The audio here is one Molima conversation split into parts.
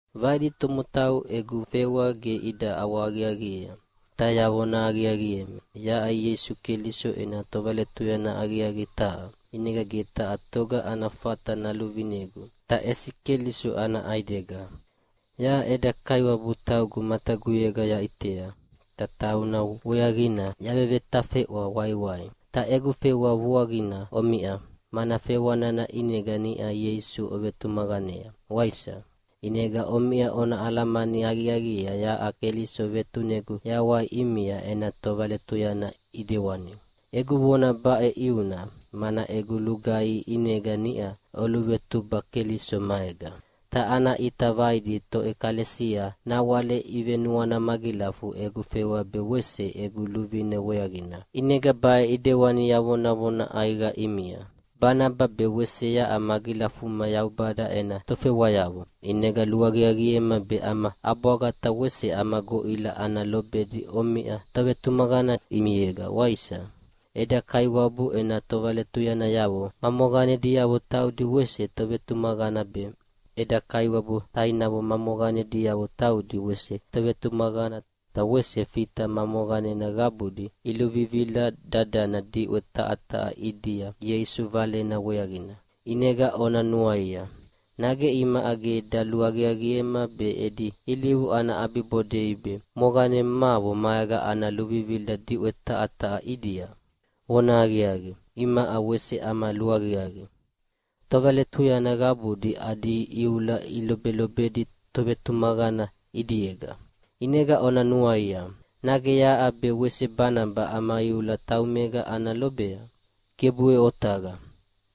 Vaidi tomotau egu fewa ge ida ʼawahaqiaqiea. Ta yavona aqiaqiemi, yaʼa Ieisu Keliso ena tovaletuyana aqiaqi taha. ʼInega ge taha toga ana fata naluvinegu, ta ʼesi Keliso ana ʼaidega. Yaʼa eda Kaiwabu taugu mataguyega yaʼitea, ta tauna weaqina yavevetafeʼwa waiwai. Ta egu fewa vuaqina omiʼa, mana fewa nana ʼinega niʼa Ieisu ovetumaqanea, waisa? ʼInega omiʼa ona alamani aqiaqiea yaʼa Keliso vetunegu yawai ʼimia ena tovaletuyana ʼidewani. Egu vona baʼe ʼiuna, mana egu lugaihi ʼinega niʼa oluvetuba Keliso maega. Ta ana ʼita vaidi toʼekalesia nawale ivenuana magilafu egu fewa be wese egu luvine weaqina, ʼinega baʼe ʼidewani yavonavona ʼaiqa ʼimia: Banaba be wese yaʼa magilafuma Yaubada ena tofewayavo, ʼinega luaqiaqiema be ama ʼabwaga ta wese ama goʼila ana lobedi omiʼa tovetumaqana ʼimiega, waisa? Eda Kaiwabu ena tovaletuyanayavo ma moqanediavo taudi wese tovetumaqana be, eda Kaiwabu tainavo ma moqanediavo taudi wese tovetumaqana ta wese Fita ma moqanena qabudi iluvivila dadana diʼwe taha taha ʼidia Ieisu Valena weaqina. ʼInega ona nuaia, nage imaʼa ge daluaqiaqiema be edi ilivu ana ʼabibodei be moqanemavo maega ana luvivila diʼwe taha taha ʼidia? Vonahaqiaqi, imaʼa wese ama luaqiaqi! Tovaletuyana qabudi adi iula ilobelobedi tovetumaqana ʼidiega. ʼInega ona nuaia, nage yaʼa be wese Banaba ama iula taumega ana lobea? Gebuʼe otaqa!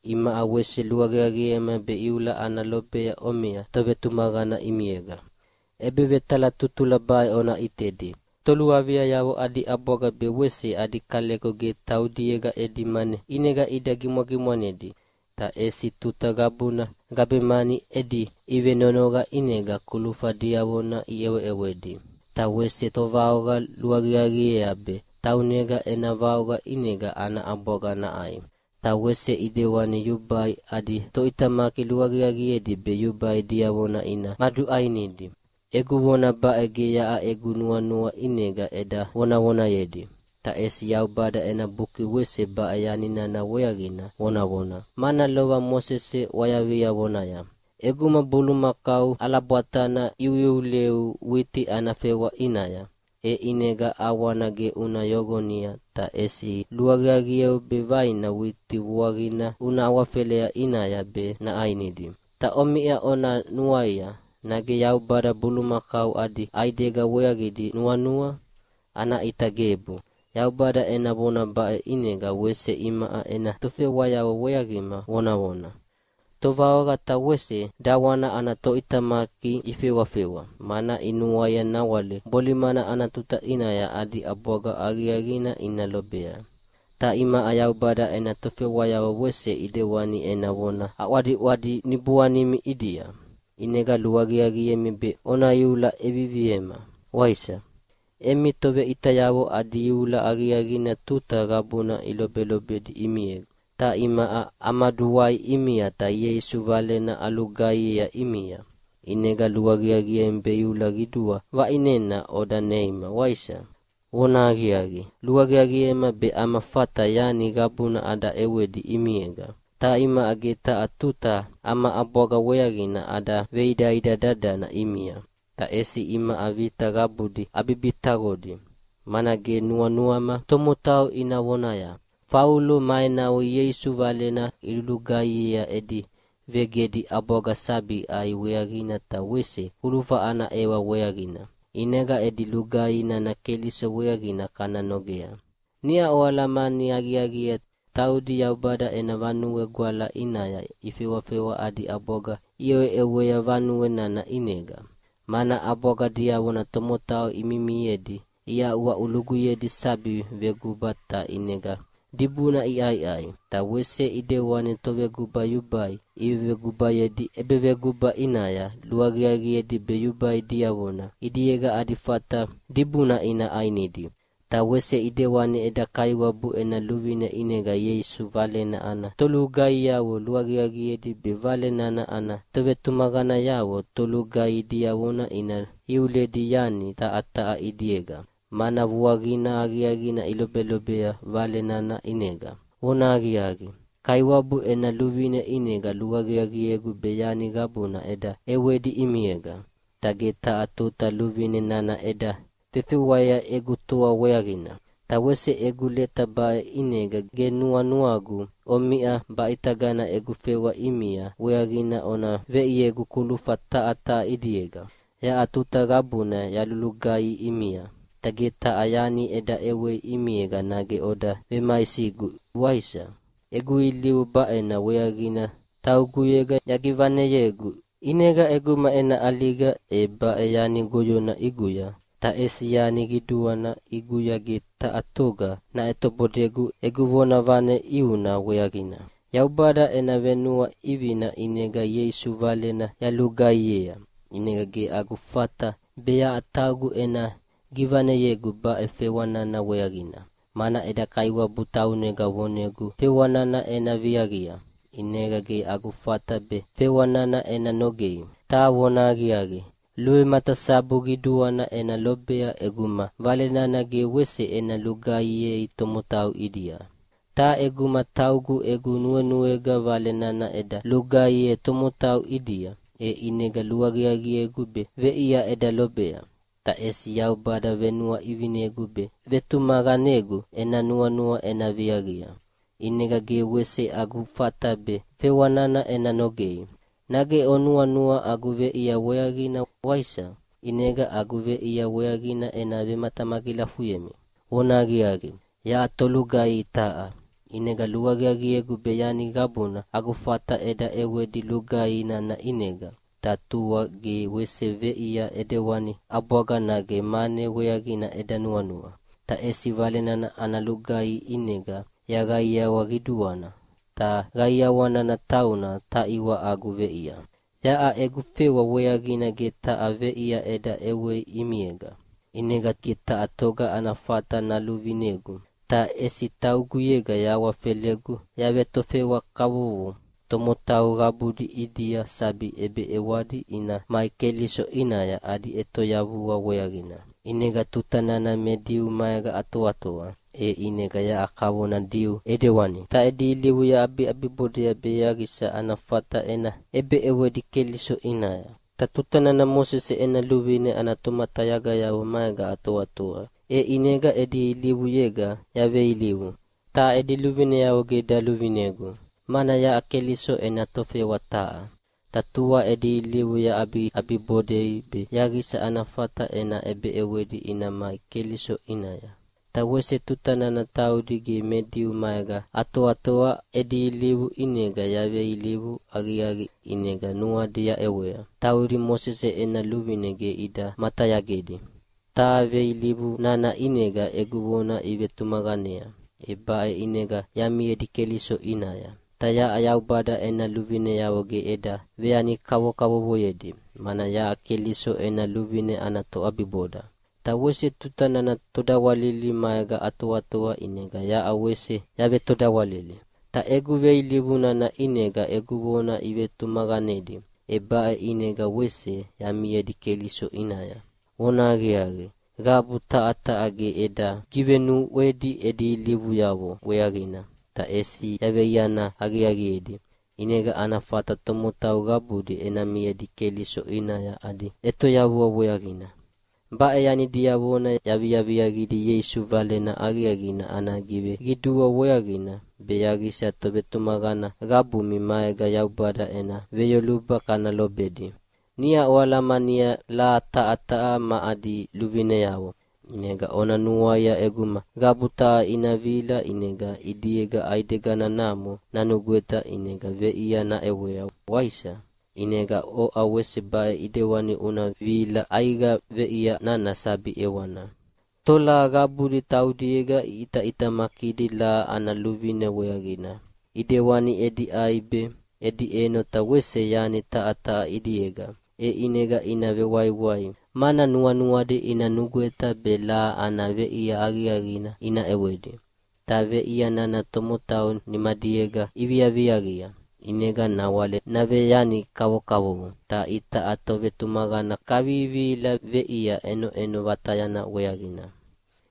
Imaʼa wese luaqiaqiema be iula ana lobea omiʼa tovetumaqana ʼimiega. ʼEbevetalatutula baʼe ona ʼitedi: Toluaviayavo adi ʼabwaga be wese adi kaleko ge taudiega edi mane ʼinega ida gimwagimwanedi, ta ʼesi tuta qabuna gabemani edi ʼivenonoqa ʼinega kulufa diavona iʼeweʼewedi. Ta wese tovaoqa luaqiaqiea be taunega ena vaoqa ʼinega ana ʼabwaga naʼai. Ta wese ʼidewani yubai adi toʼitamaki luaqiaqiedi be yubai diavona ina maduʼainidi. Egu vona baʼe ge yaʼa egu nuanua ʼinega eda vonavonayedi, ta ʼesi Yaubada ena Buki wese baʼe yani nana weaqina vonavona, mana lova Mosese ʼwayavia vonaya, “ʼEguma bulumakau ʼalabwatana iuiuleu witi ana fewa ʼinaya, e ʼinega ʼawana ge una yoqonia ta ʼesi luaqiaqieu be vaina witi vuaqina una awafelea ʼinaya be naʼainidi.” Ta omiʼa ona nuaia, nage Yaubada bulumakau adi ʼaidega weaqidi nuanua? Ana ʼita gebu, Yaubada ena vona baʼe ʼinega wese imaʼa ena tofewayavo weaqima vonavona. Tovaoqa ta wese dawana ana toʼitamaki ifewafewa, mana inuaia nawale bolimana ana tuta ʼinaya adi ʼabwaga aqiaqina ina lobea. Ta imaʼa Yaubada ena tofewayavo wese ʼidewani ena vona aʼwadidi niboanimi ʼidia, ʼinega luaqiaqiemi be ona iula ʼeviviema, waisa? Emi toveʼitayavo adi iula aqiaqina tuta qabuna ilobelobedi ʼimiega. Ta imaʼa amaduwai ʼimia ta Ieisu Valena alugaihiea ʼimia, ʼinega luaqiaqiemi be iula qidua vaʼinena oda neima, waisa? Vonahaqiaqi, luaqiaqiema be ama fata yani qabuna ada ʼewedi ʼimiega. Ta imaʼa ge taha tuta ama ʼabwaga weaqina ada veidaida dadana ʼimia. Ta ʼesi imaʼa vita qabudi abibitaqodi, mana ge nuanuama tomotau ina vonaya, “Faulo ma enavo Ieisu Valena ilulugaihiea edi vegedi ʼabwaga sabi ʼai weaqina ta wese kulufa ana ʼewa weaqina, ʼinega edi lugaihi nana Keliso weaqina kana nogea.” Niʼa oalamani aqiaqiea taudi Yaubada ena Vanue Gwala ʼinaya ifewafewa adi ʼabwaga iʼeweʼewea vanue nana ʼinega, mana ʼabwaga diavona tomotau imimiedi iaʼuaʼuluguyedi sabi veguba ta ʼinega dibuna iʼaiʼai. Ta wese ʼidewani toveguba yubai ivevegubayedi ʼebeveguba ʼinaya luaqiaqiedi be yubai diavona ʼidiega adi fata dibuna ina ʼainidi. Ta wese ʼidewani eda Kaiwabu ena luvine ʼinega Ieisu Valena ana tolugaihiavo luaqiaqiedi be Vale nana ana tovetumaqanayavo tolugaihi diavona ina iuledi yani taha taha ʼidiega, mana vuaqina aqiaqina ilobelobea Vale nana ʼinega. Vonahaqiaqi, Kaiwabu ena luvine ʼinega luaqiaqiegu be yani qabuna eda ʼewedi ʼimiega, ta ge taha tuta luvine nana eda vefewea egu toa weaqina. Ta wese egu leta baʼe ʼinega ge nuanuagu omiʼa baʼitagana egu fewa ʼimia weaqina ona veʼiegu kulufa taha taha ʼidiega. Yaʼa tuta qabuna yalulugaihi ʼimia, ta ge taha yani eda ʼewei ʼimiega nage oda vemaisigu, waisa? Egu ilivu baʼena weaqina tauguyega yagivaneyegu. ʼInega ʼeguma ena ʼaliga e baʼe yani goyona ʼiguya, ta ʼesi yani qiduana ʼiguya ge taha toga naʼetobodegu egu vonavane ʼiuna weaqina. Yaubada ena venuaʼivina ʼinega Ieisu Valena yalulugaihiea, ʼinega ge agu fata be yaʼa taugu ena givaneyegu baʼe fewa nana weaqina. Mana eda Kaiwabu taunega vonegu fewa nana ena viaqia, ʼinega ge agu fata be fewa nana ena nogei. Ta vonahaqiaqi, luvematasabu qiduana ena lobea ʼeguma Vale nana ge wese ena lugaihiei tomotau ʼidia. Ta ʼeguma taugu egu nuenuega Vale nana eda lugaihiea tomotau ʼidia, e ʼinega luaqiaqiegu be veʼia eda lobea. Ta ʼesi Yaubada venuaʼivinegu be vetumaqanegu ena nuanua ena viaqia. ʼInega ge wese agu fata be fewa nana ena nogei. Nage onuanua agu veʼia weaqina, waisa? ʼInega agu veʼia weaqina ena vematamagilafuyemi: Vonahaqiaqi, yaʼa tolugaihi taha, ʼinega luaqiaqiegu be yani qabuna agu fata eda ʼewedi lugaihi nana ʼinega, ta tua ge wese veʼia ʼidewani ʼabwaga nage mane weaqina eda nuanua. Ta ʼesi Vale nana ana lugaihi ʼinega yaqaiqaiawa qiduana, ta qaiawa nana tauna taʼiwa agu veʼia. Yaʼa egu fewa weaqina ge taha veʼia eda ʼewei ʼimiega. ʼInega ge taha toga ana fata naluvinegu, ta ʼesi tauguyega yahawafelegu yavetofewa kavovo tomotau qabudi ʼidia sabi ʼebeʼewadi ina mai Keliso ʼinaya adi ʼetoyavua weaqina. ʼInega tuta nana me Diu maega atoatoa, e ʼinega yaʼa kavona Diu ʼedewani, ta edi ilivu yaʼabiʼabibodea be yaqisa ana fata ena ʼebeʼewedi Keliso ʼinaya. Ta tuta nana Mosese ena luvine ana tomatayagayavo maega atoatoa, e ʼinega edi ilivuyega yaveilivu. Ta edi luvineavo ge daluvinegu, mana yaʼa Keliso ena tofewa taha. Ta tua edi ilivu yaʼabiʼabibodedi be yaqisa ana fata ena ʼebeʼewedi ina mai Keliso ʼinaya. Ta wese tuta nana taudi ge me Diu maega atoatoa edi ilivu ʼinega yaveilivu aqiaqi ʼinega nuadi yaʼewea. Taudi Mosese ena luvine ge ida matayagedi. Ta veilivu nana ʼinega egu vona ivetumaqanea, e baʼe ʼinega yamiedi Keliso ʼinaya. Ta yaʼa Yaubada ena luvineavo ge eda veyani kavokavovoyedi, mana yaʼa Keliso ena luvine ana toʼabiboda. Ta wese tuta nana todawalili maega atoatoa ʼinega yaʼa wese yavetodawalili. Ta egu veilivu nana ʼinega egu vona ivetumaqanedi, e baʼe ʼinega wese yamiedi Keliso ʼinaya. Vonahaqiaqi, qabu taha taha ge eda givenuʼwedi edi ilivuyavo weaqina, ta ʼesi yaveiana aqiaqiedi, ʼinega ana fata tomotau qabudi ena miedi Keliso ʼinaya adi ʼetoyavua weaqina. Baʼe yani diavona yaviaviaqidi Ieisu Valena Aqiaqina ana giveqidua weaqina be yaqisa tovetumaqana qabumi maega Yaubada ena veyoluba kana lobedi. Niʼa oalamania laha taha taha ma adi luvineavo, ʼinega ona nuaia ʼeguma qabu taha ina vihila ʼinega ʼidiega ʼaideganamo nanugweta ʼinega veʼia naʼewea, waisa? ʼInega oʼa wese baʼe ʼidewani una vihila ʼaiqa veʼia nana sabi ʼewana. Tolaha qabudi taudiega iʼitaʼitamakidi laha ana luvine weaqina, ʼidewani edi ʼai be, edi ʼeno ta wese yani taha taha ʼidiega, e ʼinega ina vewaiwai, mana nuanuadi ina nugweta be laha ana veʼia aqiaqina ina ʼewedi. Ta veʼia nana tomotau nimadiega iviaviaqia, ʼinega nawale naveyani kavokavovo. Ta itaʼa tovetumaqana kavivihila veʼia ʼenoʼeno vatayana weaqina.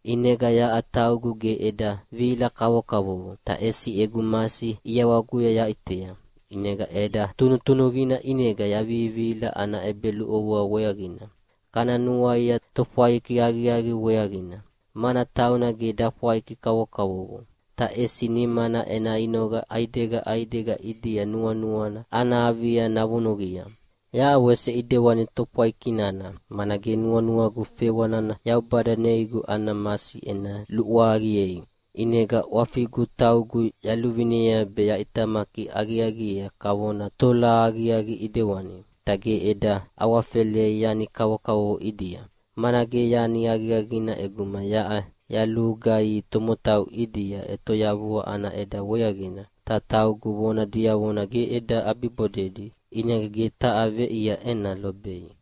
ʼInega yaʼa taugu ge eda vihila kavokavovo, ta ʼesi egu masi ʼiawaguya yaʼitea, ʼinega ʼeda tunutunuqina ʼinega yavivihila ana ʼebeluʼovoa weaqina. Kana nuaia tofwaiki aqiaqi weaqina, mana tauna ge dafwaiki kavokavovo, ta ʼesi nimana ena inoqa ʼaidega ʼaidega ʼidia nuanuana ana avia navunuqia. Yaʼa wese ʼidewani tofwaiki nana, mana ge nuanuagu fewa nana Yaubada neigu ana masi ena luʼwaqiei. ʼInegana ʼwafigu taugu yaluvinea be yaʼitamaki aqiaqiea kavona tolaha aqiaqi ʼidewani, ta ge eda awafelei yani kavokavovo ʼidia. Mana ge yani aqiaqina ʼeguma yaʼa yalulugaihi tomotau ʼidia ʼetoyavua ana ʼeda weaqina, ta taugu vona diavona ge eda ʼabibodedi, ʼinega ge taha veʼia ena lobei.